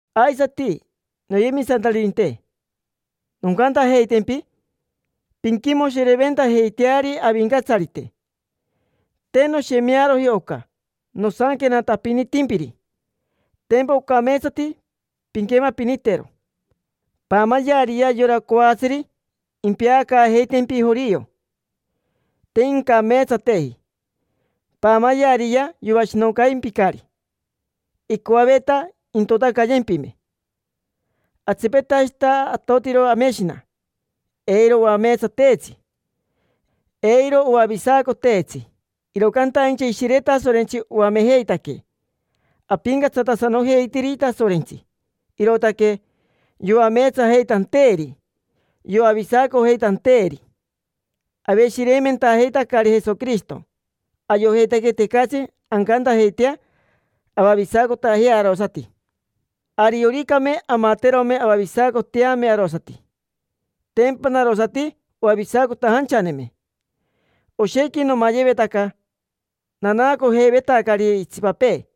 Aisati, noyemisantaririnte, noncantajeitempi: pinquimoshireventajeiteari Avincatsarite. Te noshemearoji oca nosanquenatapinitimpiri, tempa ocameetsati pinquemapinitero. Paamayeariyea yora coatsiri impeacaajeitempi jorio: te incameetsateji. Paamayeariyea, yoashinoncaimpicari, icoaveta intotacayempime. Atsipetashita atotiro ameshina, eiro oameetsateetsi, eiro oavisacoteetsi. Iro cantaincha Ishire Tasorentsi oamejeitaquee apincatsatasanojeitiri Tasorentsi, irootaque yoameetsajeitanteeri, yoavisacojeitanteeri. Aveshireimentajeitacari Jesoquirishito, ayojeitaque tecatsi ancantajeitea avavisacotajea arosati. Arioricame amaterome avavisacoteame arosati, tempa narosati oavisacotajanchaneme. Oshequi nomayevetaca, nanaacojeivetacari itsipapee.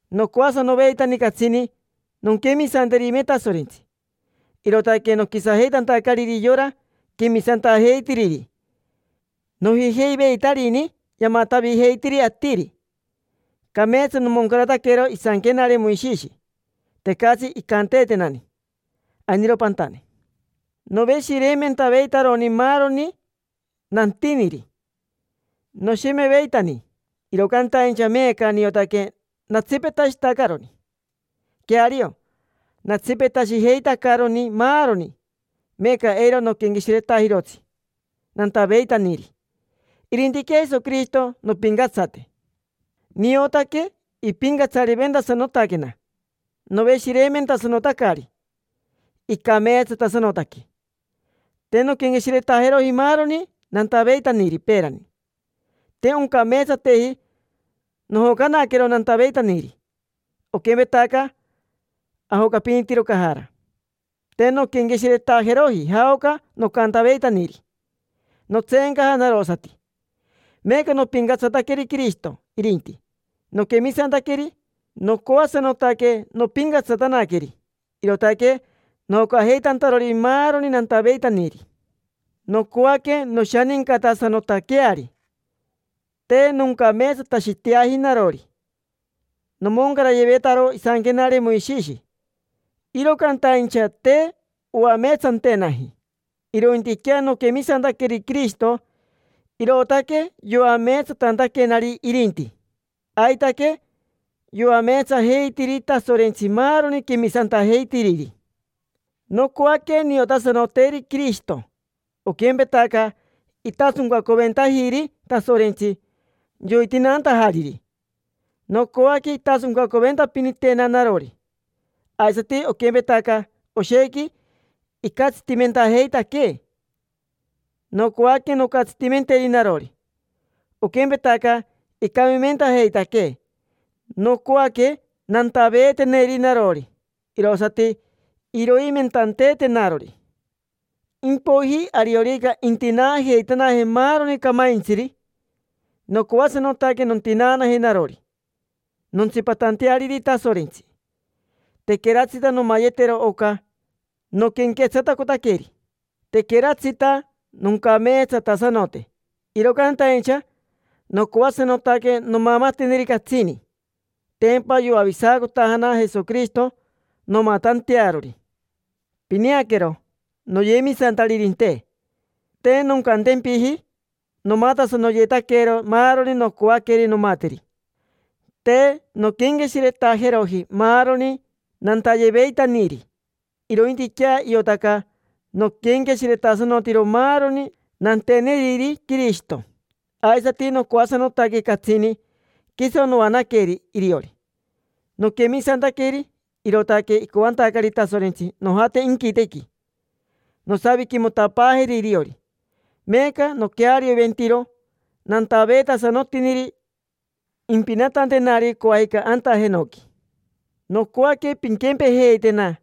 Nocoasanoveitani catsini nonquemisanterime Tasorentsi, irootaque noquisajeitantacariri yora quemisantajeitiriri: nojijeiveitarini yamatavijeitiri atiri. Cameetsa nomoncarataquero isanquenare Moishishi, tecatsi incanteetenani: “Ainiro pantane”. Noveshireimentaveitaroni maaroni nantiniri, noshemeveitani, iro cantaincha meeca niotaque natsipetashitacaroni. Queario, natsipetashijeitacaroni maaroni. Meeca eiro noquenqueshiretajirotsi nantaveitaniri, irintiquea Jesoquirishito nompincatsate. Niotaque ipincatsariventasanotaquena, noveshireimentasanotacari, icameetsatasanotaque. Te nonquenqueshiretajeroji maaroni nantaveitaniri peerani: te oncameetsateji, nojocanaquero nantaveitaniri, oquempetaca ajocapinitiro cajara. Te nonquenqueshiretajeroji jaoca nocantaveitaniri, notseencaja narosati; meeca nopincatsataqueri Quirishito irinti, noquemisantaqueri. Nocoasanotaque nompincatsatanaqueri, irootaque nojocajeitantarori maaroni nantaveitaniri. Nocoaque noshanincatasanotaqueari. Te noncameetsatashiteaji narori: nomoncarayevetaro isanquenare Moishishi, iro cantaincha te oameetsantenaji. Irointiquea noquemisantaqueri Quirishito, irootaque yoameetsatantaquenari irinti. Aitaque, yoameetsajeitiri Tasorentsi maaroni quemisantajeitiriri. Nocoaque niotasanoteri Quirishito. Oquempetaca itasoncacoventajiri Tasorentsi yoitinaantajariri, nocoaque intasoncacoventapinitena narori. Aisati, oquempetaca oshequi icatsitimentajeitaquee, nocoaque noncatsitimenteri narori; oquempetaca icamimentajeitaquee, nocoaque nantaveeteneri narori irosati iroimentanteetenarori. Impoiji ariorica intinaajeitanaje maaroni camaintsiri, nocoasanotaque nontinaanaje narori, nontsipatanteariri Tasorentsi. Tequeratsita nomayetero oca noquenquetsatacotaqueri, tequeratsita noncameetsatasanote. Iro cantaincha nocoasanotaque nomamateneri catsini, tempa yoavisacotajana Jesoquirishito nomatantearori. Pineaquero, noyemisantaririnte: te noncantempiji nomatasanoyetaquero maaroni nocoaqueri nomateri. Te nonquenqueshiretajeroji maaroni nantayeveitaniri, irointiquea iotaca noquenqueshiretasanotiro maaroni nanteneriri Quirishito, aisati nocoasanotaque catsini quiso noanaqueri iriori. Noquemisantaqueri, irootaque icoantacari Tasorentsi nojate inquitequi, nosaviquimotapaajeri iriori. Meeca noquearioventiro nantaveetasanotiniri impinatantenari coajica anta jenoqui. Nocoaque pinquempejeitena,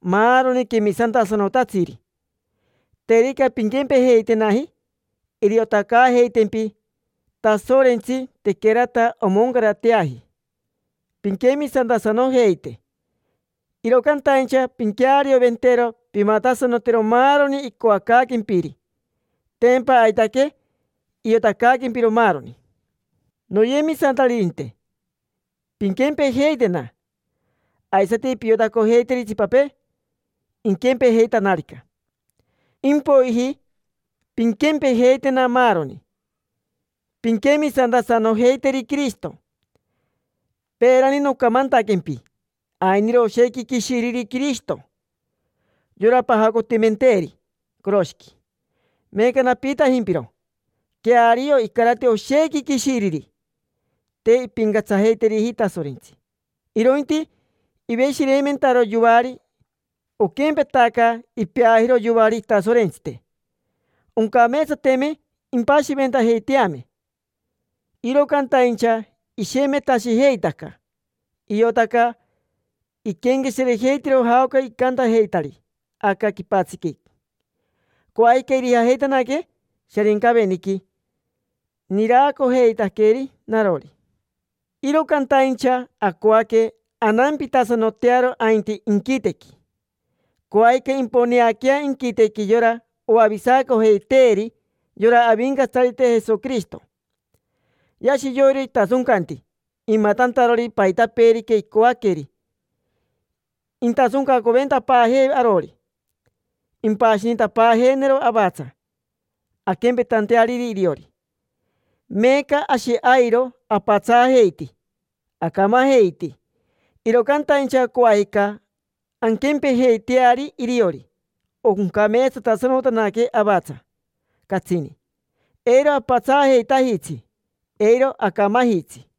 maaroni quemisantasanotatsiri. Terica pinquempejeitenaji, iriotacaajeitempi Tasorentsi tequerata omoncarateaji pinquemisantasanojeite. Iro cantaincha pinquearioventero pimatasanotero maaroni icoacaaquempiri. Tempa aitaque iotacaaquempiro maaroni. Noyemisantaririnte, pinquempejeitena. Aisati piotacojeiteri itsipapee, iquempejeitanarica. Impoiji pinquempejeitena maaroni: pinquemisantasanojeiteri Quirishito. Peerani nocamantaquempi ainiro oshequi quishiriri Quirishito: yora pajacotimenteeri coroshiqui. Meeca napiitajimpiro: queario icarati oshequi quishiriri. Te impincatsajeiteriji Tasorentsi, irointi iveshireimentaro yoari: oquempetaca ipeajiro yoari itasorentsite. Oncameetsateme impashiventajeiteame, iro cantaincha ishemetashijeitaca. Iotaca iquenqueshirejeitiro jaoca icantajeitari aca quipatsiqui. Coajica irijajeitanaque Sharincaveniqui. Niraacojeitaqueri narori. Iro cantaincha acoaque anampitasanotearo ainti inquitequi. Coajica imponeaquea inquitequi yora oavisacojeiteeri: yora Avincatsarite Jesoquirishito. Yashi yoiro itasoncanti, imatantarori paitapeerica icoaqueri. Intasoncacoventapaajee arori, impashinitapaajeenero avatsa, anquempetanteariri iriori. Meeca ashi airo apatsaajeiti, acamajeiti; iro cantaincha coajica anquempejeiteari iriori, oncameetsatasanotanaque avatsa, catsini: eiro apatsaajeitajitsi, eiro acamajitsi.